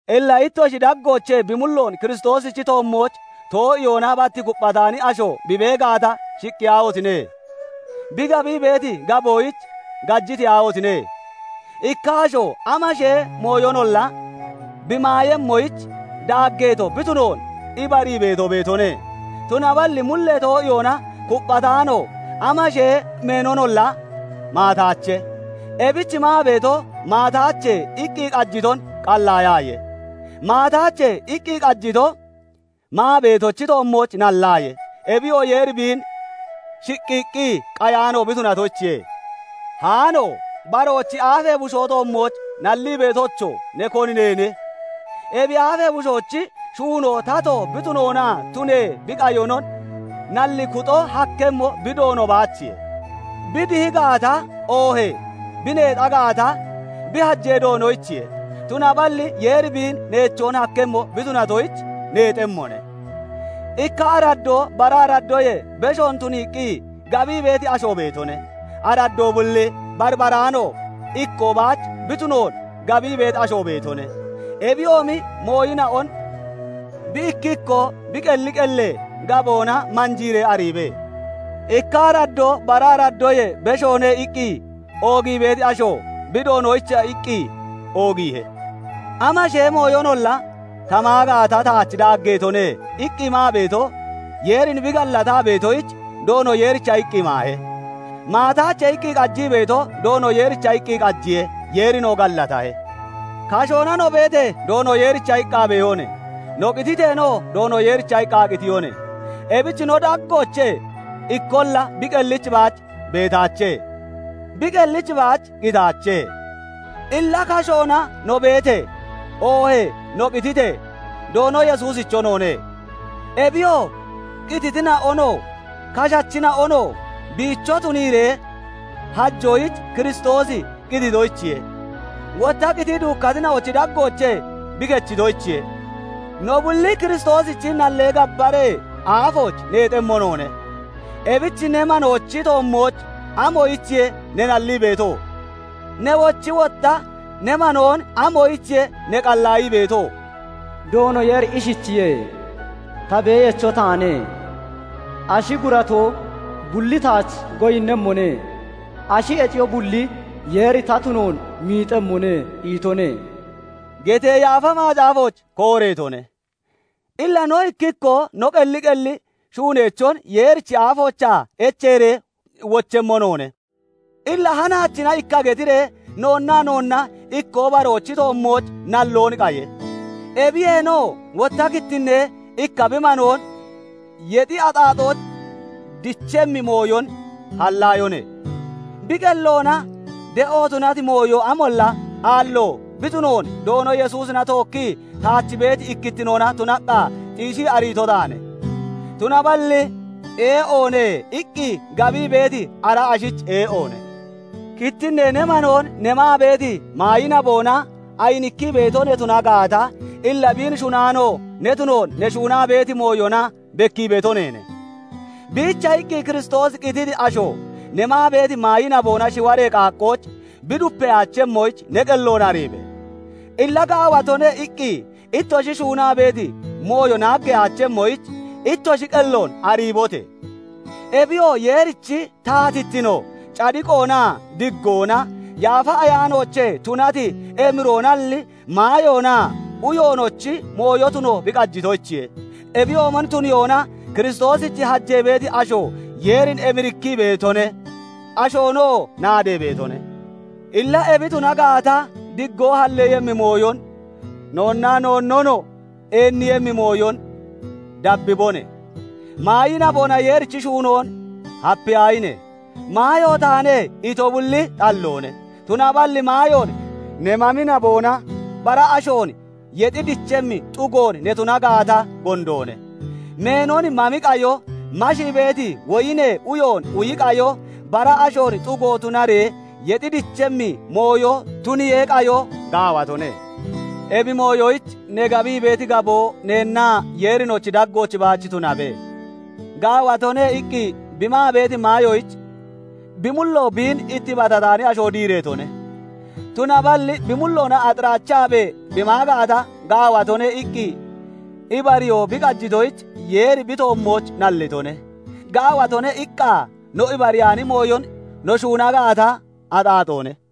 Illa ittoshi daggoochee bi mulloon Kiristoosichi toommooch too'iyoona bat kupphataani asho bi bee gaata, shiqqiyaahotine! Bi gabii beeti gaboyich gajiteyaahotine! Ikka asho amashee mooyonolla bi maayemmoyich daaggeeto bi tunoon ibarii beeto beetone; tunaballi mullee too'iyoona kupphataano amashee meenonolla maataache. Ebich maa beeto "Maataache" iqqi qajiton qallaayaaye; "Maataache" iqqi qajito maa beetochi toommooch nallaaye. Ebiyoo Yeeri biin shiqqiiqqi qayaano bi tunatoyichiye. Haano! Baroochi aafee bushoo toommooch nallii beetocho! Ne koni neene? Ebi aafee bushoochi shuunoo tato bi tunoonaa tunee bi qayonon nallii kuxon hakkemmo bi doono baachiye; bi dihi gaata, oohee bi neexa gaata, bi hajee doonoyichiye; tunaballi Yeeri biin neechoon hakkemmo bi tunatoyich neexemmone. Ikka araddoo bara araddoyee beshoon tuniiqqi gabii beeti asho beetone; araddoo bulli barbaraano, ikkoo baach bi tunoon gabii beeti asho beetone. Ebiyoomi mooyina'on bi ikki ikkoo bi qelli qellee gaboona manjiiree ariibe. "Ikka araddoo bara araddoyee beshoone" iqqi oogii beeti asho bi Doonoyicha iqqi oogiihe. "Amashee mooyonolla ta maa gaata taach daaggeetone" iqqi maa beeto Yeerin bi gallataa beetoyich, Doono Yeericha iqqi maahe. "Maataache" iqqi qajii beeto Doono Yeericha iqqi qajiye; Yeerinoo gallatahe. Kashoona no beetee, Doono Yeericha iqqa beehone; no qititeenoo Doono Yeericha iqqa qitiyone. Ebich no daggoochee ikkolla bi qellich baach beetaache; bi qellich baach qitaache. Illa kashoona no beetee, oohee no qititee, Doono Yesuusicho noone. Ebiyoo qititina'onoo kashachina'onoo biicho tuniiree hajoyich Kiristoosi qititoyichiye; wotta qitii duukkatina'ochi daggoochee bi kechitoyichiye. No bulli Kiristoosichi nallee gabbaree aafooch neexemmo noone. Ebich ne manoochi toommooch amoyichiye ne nallii beeto? Newochi wotta ne manoon amoyichiye ne qallaayii beeto? "Doono Yeeri ishichiye:- 'Ta Beeyacho taane; ashi guratoo bulli taach goyinnemmone; ashi heciyoo bulli Yeeri ta tunoon miixemmone' itone" getee Yaafa Macaafooch kooreetone. Illa no ikki ikkoo no qelli qelli shuuneechon Yeerichi aafoochaa echeeree wochemmo noone. Illa hanaachina ikka getiree noonnaa noonna ikkoo baroochi toommooch nalloon qaye. Ebiyeenoo wotta kittinnee ikka bi manoon yexi axaaxooch dechemmi mooyon hallaayone. Bi qelloona ee'o tunati mooyo amolla aallo bi tunoon Doono Yesuusina tookkii taach beeti ikkittinoona tunaqqa xiishii ariito taane; tunaballi "Ee'oone" iqqi gabii beeti ara ashoyich ee'oone. Kittinnee ne manoon ne maa beeti maayi naboona ayinikkii beeto ne tuna gaata, illa biin shunaano ne tunoon ne shuunaa beeti mooyona bekkii beeto neene. Biicha iqqi Kiristoosi qititi asho ne maa beeti maayi naboona shiwaree qaaqqooch bi dupeyaachemmoyich ne qelloon ariibe! Illa "Gaawatone" iqqi ittoshi shuunaa beeti mooyo naaggeyaachemmoyich ittoshi qelloon ariibote! Ebiyoo Yeerichi taatittino cadiqoonaa diggoona, Yaafa Ayaanoochee tunati emiroonalli, maayoonaa uyoonochi mooyo tuno bi qajitoyichiye. Ebiyoomon tuniyoona Kiristoosich hajee beeti asho Yeerin emirikkii beetone; ashoonoo naadee beetone. Illa ebi tuna gaata, diggoo halleeyemmi mooyon, noonnaa noonnonoo eenniiyemmi mooyon dabbibone. Maayi naboona Yeerichi shuunoon hapiyaahine! "Maayo taane" ito bulli xalloone; tunaballi maayoon ne mami naboona bara ashoon yexi dichemmi xugoon ne tuna gaata, gondoone. Meenon mami qayo, mashii beeti woyinee uyoon uyi qayo, bara ashoon xugo tunaree yexi dichemmi mooyon tuniyee qayoo gaawatone. Ebi mooyoyich ne gabii beeti gaboo neennaa Yeerinochi daggooch baach tunabe. "Gaawatone" iqqi bi maa beeti maayoyich bi mullo biin ittibatataani asho diireetone. Tunaballi bi mulloona axiraachaabee bi maa gaata, "Gaawatone" iqqi ibariyoo bi qajitoyich, Yeeri bi toommooch nallitone. "Gaawatone" iqqa no ibariyaani mooyon no shuuna gaata, axaaxoone.